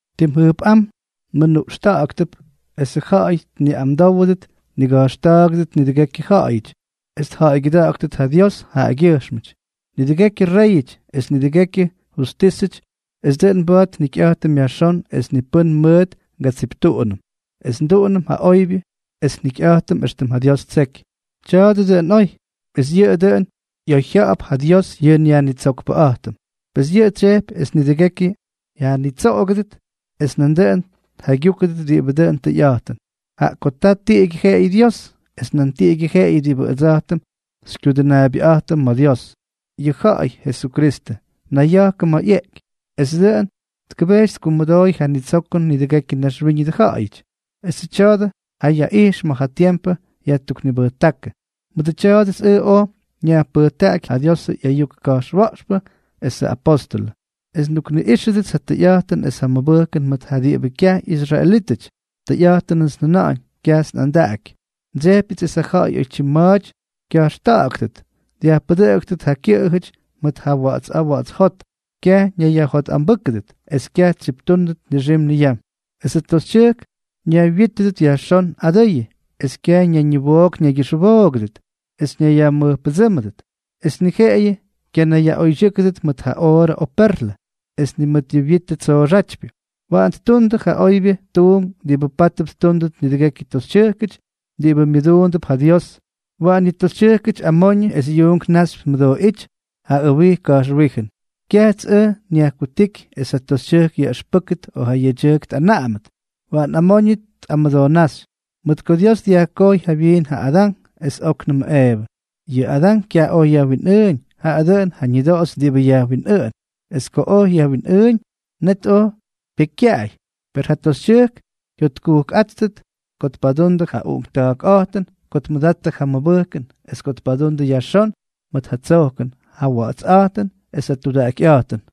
Tim jʉjpꞌám nmʉnuꞌxtáktʉp esʉ ja̱ꞌa̱y tniꞌamdówʉdʉt, tniga̱jxta̱a̱gʉdʉt nidʉgekyʉ ja̱ꞌa̱yʉty, es tja̱ꞌa̱ygyʉda̱ꞌa̱ktʉt ja Dios jaꞌagyʉjxmʉty, nidʉgekyʉ réyʉty es nidʉgekyʉ justísʉty, es dʉꞌʉn mba̱a̱t njikyꞌa̱jtʉm yajxón es ni pʉ́n mʉʉt ngatsiptuꞌunʉm, es nduꞌunʉm ja oybyʉ es njikyꞌa̱jtʉm éxtʉm ja Dios ttseky. Tya̱a̱dʉ dʉꞌʉn oy, es yʉꞌʉ dʉꞌʉn ꞌyoyjya̱ꞌa̱p ja Dios yʉ nYajnitsokpʉꞌa̱jtʉm, pes yʉꞌʉ tsyejpy es nidʉgekyʉ yajnitsoꞌogʉdʉt es nandʉꞌʉn tjaygyúkʉdʉt diꞌibʉ dʉn tʉyꞌa̱jtʉn. Jaꞌa ko ta tiꞌigyʉ jeꞌeyʉ Dios, es nan tiꞌigyʉ jeꞌeyʉ diꞌibʉ ʉdsa̱jtʉm xykyudʉnaabyʉꞌa̱jtʉm ma̱ Dios, yʉ ja̱ꞌa̱y Jesukristʉ, nayya̱jkʉ ma̱ ꞌyeꞌky, es dʉꞌʉn tkʉbejty tkumʉdooy ja ñitsokʉn nidʉgekyʉ naxwíñʉdʉ ja̱ꞌa̱yʉty. Esʉ tya̱a̱dʉ jayaꞌijx ma̱ ja tiempʉ yajtuknibʉjtákʉ. Mʉdʉ tya̱a̱dʉts ʉj oj nyajpʉjtaꞌaky ja Diosʉ ꞌyayuk ka̱jxwa̱ꞌxpʉ esʉ apóstʉlʉ, es ndukniꞌíxʉdʉts ja tʉyꞌa̱jtʉn es ja mʉbʉjkʉn mʉt ja diꞌibʉ kyaj ꞌyisraelítʉty. Tʉyꞌa̱jtʉnʉts njʉna̱ꞌa̱ñ, kyajts nꞌandaꞌaky. Ndsejpyʉts esʉ ja̱ꞌa̱y oytyim ma̱a̱ty kya̱jxta̱ꞌa̱ktʉt, dyajpʉdʉꞌʉktʉt ja kyʉꞌʉjʉty mʉt ja wa̱ꞌa̱ts a̱a̱ wa̱ꞌa̱ts jot, kyaj ñayyajjotꞌambʉ́kʉdʉt es kyaj tsyiptúnʉt nixim niyam. Esʉ toxytyʉjk ñaywyítʉdʉt yajxón adʉyʉ, es kyaj ñayñiwook ñaygyʉxwoogʉdʉt es ñayyajmʉjpʉdsʉ́mʉdʉt, es ni jeꞌeyʉ kyanayyaꞌoydyʉ́kʉdʉt mʉt ja oorʉ o perlʉ, es ni mʉt ja wyitʉ tsooxʉtypyʉ. Waꞌan ttundʉ ja oybyʉ tuunk diꞌibʉ pátʉp ttúndʉt nidʉgekyʉ toxytyʉjkʉty diꞌibʉ myʉduundʉp ja Dios. Waꞌan yʉ toxytyʉjkʉty amoñʉ es yuunk naxypy tmʉdooꞌíty ja ʉwij ka̱jxwíjʉn. Kyajts ʉj nyajkutíky es ja toxytyʉjk yaꞌʉxpʉ́kʉt o ja yedyʉjk tꞌanaꞌamʉt. Waꞌan amoñʉ tꞌamʉdoonáxy, mʉt ko Dios dyajkojy jawyiin ja Adán es óknʉmʉ Eevʉ. Yʉ Adán kyaj oj yajwinꞌʉʉñ, jaꞌa dʉꞌʉn ja ñʉdoꞌoxy diꞌibʉ yajwinꞌʉꞌʉn, es ko oj yajwinꞌʉʉñ, net oj pyekykyaꞌay. Per ja toxytyʉjk jyotkujkꞌáttʉt ko tpadundʉ ja uꞌunkta̱a̱kꞌa̱jtʉn, ko tmʉdattʉ ja mʉbʉjkʉn, es ko tpadundʉ yajxón mʉt ja tsojkʉn, ja wa̱ꞌa̱tsꞌa̱jtʉn es ja tudaꞌakyꞌa̱jtʉn.